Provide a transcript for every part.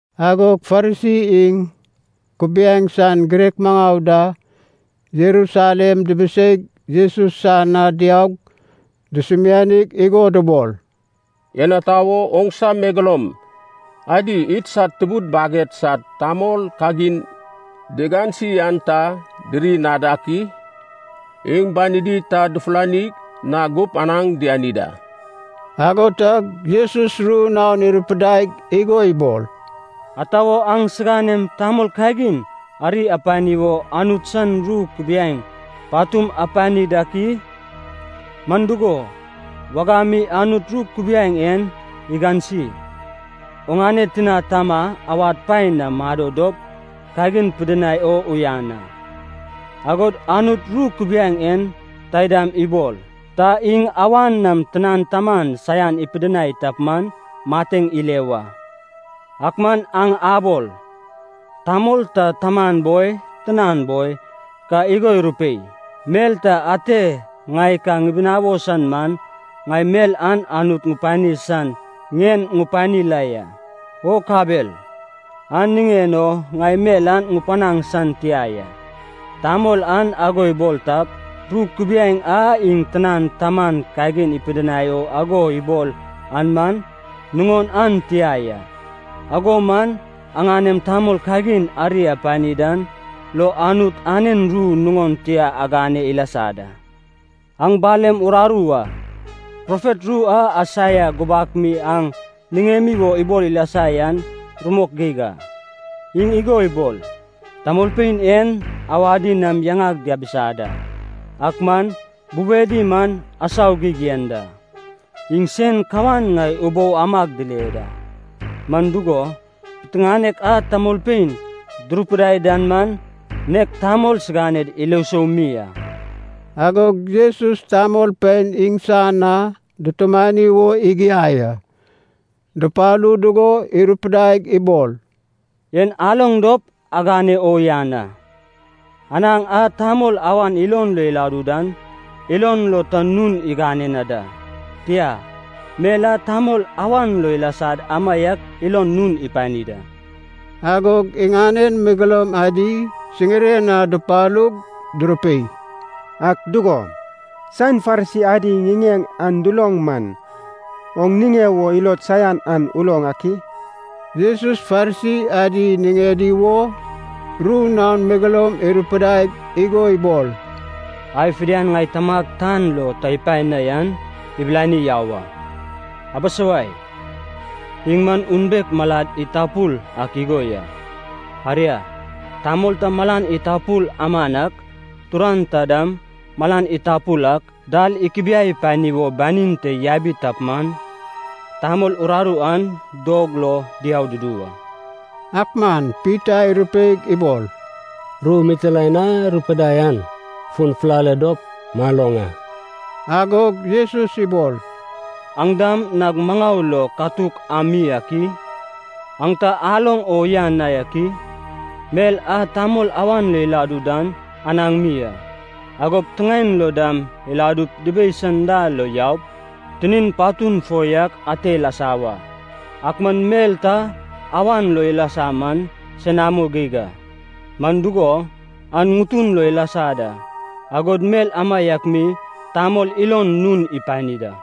Agog Farisi iŋ kubiaeŋ san girek maŋau da Jerusalem dibiseig Jesus san na diaug dusumianig igo dubol, “En ata wo oŋsa megeloum adi idsad tubud baged sad tamol kagin digansi an ta diri na dak i? Iŋ banidi ta dufulani na gup anaŋ diani da.” Ago tag Jesus ru naon irupidaig igo ibol, “Ata wo aŋ siganem tamol kagin ari apani wo Anut san ru kubiaeŋ patum apani dak i? Man dugo, wagam mi Anut ru kubiaeŋ en igansi, ‘Oŋane tina tama awad paen na mado dop kagin pidinai o uyan a.’ Agod Anut ru kubiaeŋ en taidam ibol, ‘Ta iŋ awan nam tinan taman saian ipidinai tap man, mateŋ ile wa.’ Ak man aŋ abol, ‘Tamol ta taman boi, tinan boi, ka igo irupei, mel ta ate ŋai ka ŋibinawo san man, ŋai mel an Anut ŋupani san ŋien ŋupani la ya. O kabel, an niŋen o ŋai mel an ŋupanaŋ san tia ya. Tamol an ago ibol tap, ru kubiaeŋ a iŋ tinan taman kagin ipidinai o ago ibol an man, nuŋon an tia ya.’ Ago man aŋanem tamol kagin ari apani dan lo Anut anen ru nuŋon tia agane ilasa da. Aŋ balem rararu a! Profet ru a Aisaia gubak mi aŋ niŋemi wo ibol ilasa yan rumok geig a. Iŋ igo ibol, ‘Tamolpein en awadi nam yaŋag diabisa da, ak man bubedi man asau geig yen da. Iŋ sen kawan ŋai ubou amag dile da, man dugo, piteŋanek a tamolpein durupidai dan man nek tamol siganed ilo sou mi a.’” Agog Jesus tamolpein iŋsan na dutumani wo igiai a. Dupalu dugo irupidaig ibol, “En aloŋ dop aŋane o uyanan a! Anaŋ a tamol awan ilon lo iladu dan, ilon ta nun igane na da. Tia, mel a tamol awan lo ilasad amaiak ilon nun ipani da.” Agog iŋanen megeloum adi siŋiren na dupalug durupei, “Ak dugo, saen Farisi adi ŋiŋeŋ an duloŋ man, oŋ niŋe wo ilod saian an uloŋ ak i?” Jesus Farisi adi niŋedi wo ru naon megeloum irupidaig igo ibol, “Ai fidian ŋai Tamag tan lo ta ipae na yan, ibilani yau a. Abisawai, iŋ man unbek malad itapul ak igo ya. Aria, tamol ta malan itapul aman ak, turan ta dam malan itapul ak, dal ikubiai pani wo banin te yabi tap man, tamol uraru an dog lo diau dudu wa.” Ak man Pita irupeig ibol, “Ru mitilaen a rupidai an fun fulale dop maloŋ a.” Agog Jesus ibol, “Aŋ dam nag maŋau lo katuk am mi ak i? Aŋ ta aloŋ o uyan na yak i? Mel a tamol awan lo iladu dan anaŋ mi a, agop tiŋaen lo dam iladup dibei san dal lo yaup tinin patun fo yak ate ilasa wa. Ak man mel ta awan lo ilasa man senamo geig a, man dugo, an ŋutun lo ilasa da, agod mel amaiak mi tamol ilon nun ipani da.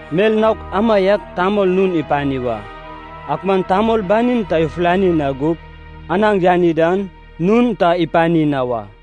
Mel naok amaiak tamol nun ipani wa. Ak man tamol banin ta ifulani na gup anaŋ yani dan, nun ta ipani na wa.”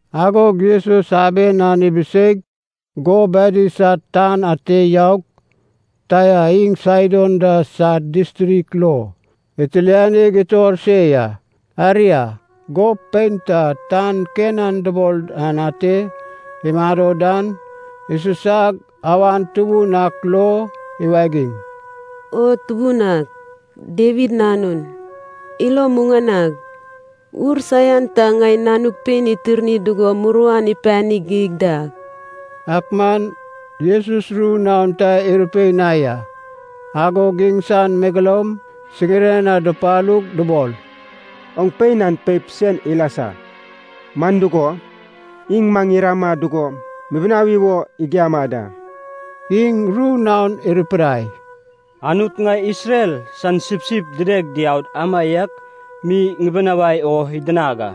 Agog Jesus aben an ibiseig gob adi sad tan ate yaug, Taia iŋ Saidon da sad distrik lo itilianig itor se ya. Aria, gob pein ta tan Kenan dubol dan ate imado dan isusag awan tubun ak lo iwagiŋ, “O Tubun ak, Dawid Nanun, ilo imuŋanag! Ur saian ta ŋai nanug pein itirni dugo muruan ipani geig da.” Ak man Jesus ru naon ta irupei na ya. Agog iŋsan megeloum siŋiren na dupalug dubol, “Oŋ pein an peip sen ilasa, man dugo, iŋ maŋ irama dugo mibinawi wo igiama da.” Iŋ ru naon irupidai, “Anut ŋai Isrel san sipsip dideg diaud amaiak mi ŋibinawai o idinag a.”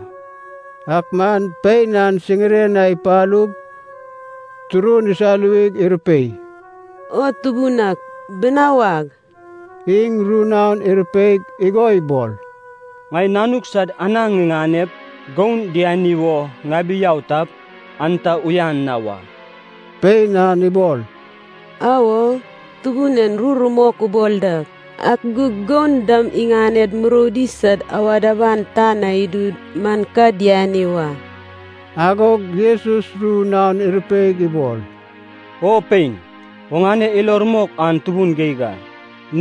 Ak man pein an siŋiren na ipalug turun isaluwig irupei, “O Tubun ak, binawag!” Iŋ ru naon irupeig igo ibol, “Ŋai nanuk sad anaŋ ŋiŋanep goun diani wo ŋabi yau tap, an ta uyan na wa.” Pein an ibol, “Awo, Tubun en ru rumok ubol da. Ak gug goun dam iŋaned muroudi sad awad aban tan na idu man ka diani wa.” Agog Jesus ru naon irupeig ibol, “O pein, oŋane ilo rumok an tubun geig a!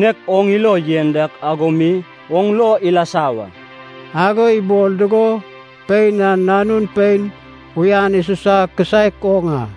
Nek oŋ ilo yen dak ago mi oŋ lo ilasa wa.” Ago ibol dugo pein an nanun pein uyan isusa kisaek oŋ a.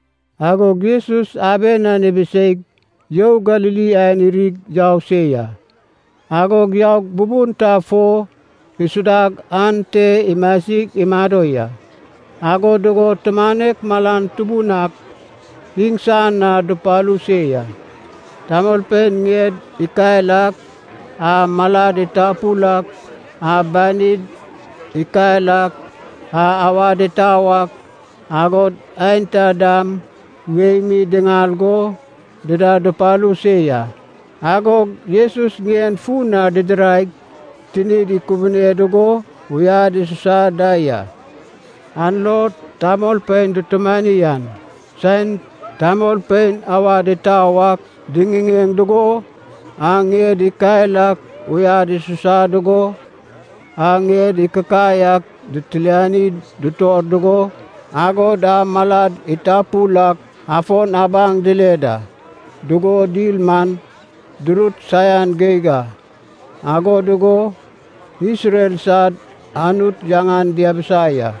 Agog Jesus aben an ibiseig You Galili aen irig yau se ya. Agog yaug bubun ta fo isudag ante imasig imado ya. Ago dugo tumanek malan tubun ak iŋsan na dupalu se ya. Tamolpein ŋied ikael ak, a malad itapul ak, a banid ikael ak, a awad itau ak, agod aenta dam wei mi diŋal go dida dupalu se ya. Agog Jesus ŋien fun na didiraig tinid ikubune dugo uyad isusa da ya. An lo tamolpein dutumani an, saen tamolpein awad itau ak diŋiŋeŋ dugo, a ŋied ikael ak uyad isusa dugo, a ŋied ikikai ak ditiliani ditor dugo, agod a malad itapul ak afon abaŋ dile da dugo dil man, durut saian geig a. Ago dugo Isrel sad Anut yaŋan diabisa ya.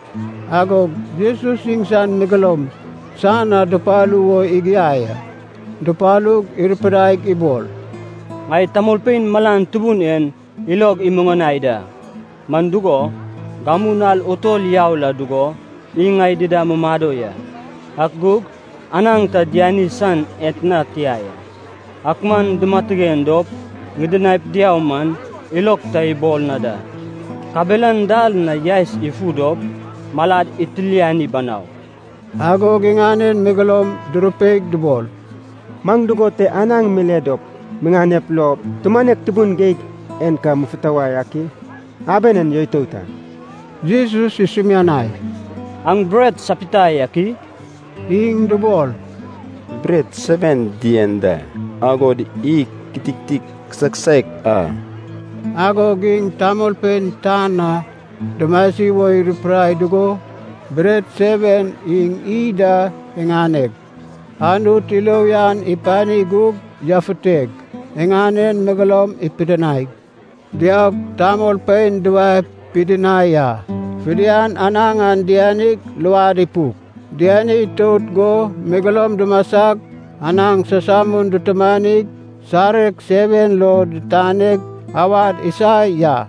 Agog Jesus iŋsan megeloum san na dupalu wo igiai a. Dupalug irupidaig ibol, “Ŋai tamolpein malan tubun en ilog imuŋanai da, man dugo, gamu nal utol yau la dugo iŋ ŋai dida mumado ya, ak gug anaŋ ta diani san etna tia ya. Ak man dimatigen dop ŋidinaip diau man, ilog ta ibol na da, kabelan dal na yaes ifu dop malad itiliani banau.” Agog iŋanen megeloum durupeig dubol, “Maŋ dugon te anaŋ mile dop miŋanep lo tumanek tubun geig en ka mufutuwai ak i? Aben en yoitout a.” Jesus isumianai, “Aŋ bret sapita yak i?” Iŋ dubol, “Bret seven dien da, agod iy kititik kisaek kisaek a.” Agog iŋ tamolpein tan na dumasi wo irupidai dugo bret seven iŋ iy da iŋaneg, Anut ilo uyan ipani gug yafuteg iŋanen megeloum ipidinaig, diaug tamolpein duwae pidinai a. Fidian anaŋ an dianig luad ipuk. Diani itout go megeloum dumasag anaŋ samsamun dutumanig sareg seven lo ditaneg awad isa ya.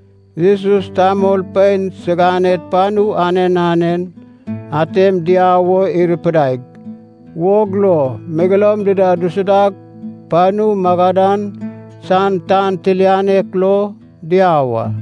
Jesus tamolpein siganed panu anen anen atem diau wo irupidaig, wog lo megeloum dida dusudag, panu Magadan san tan tilianek lo diau a.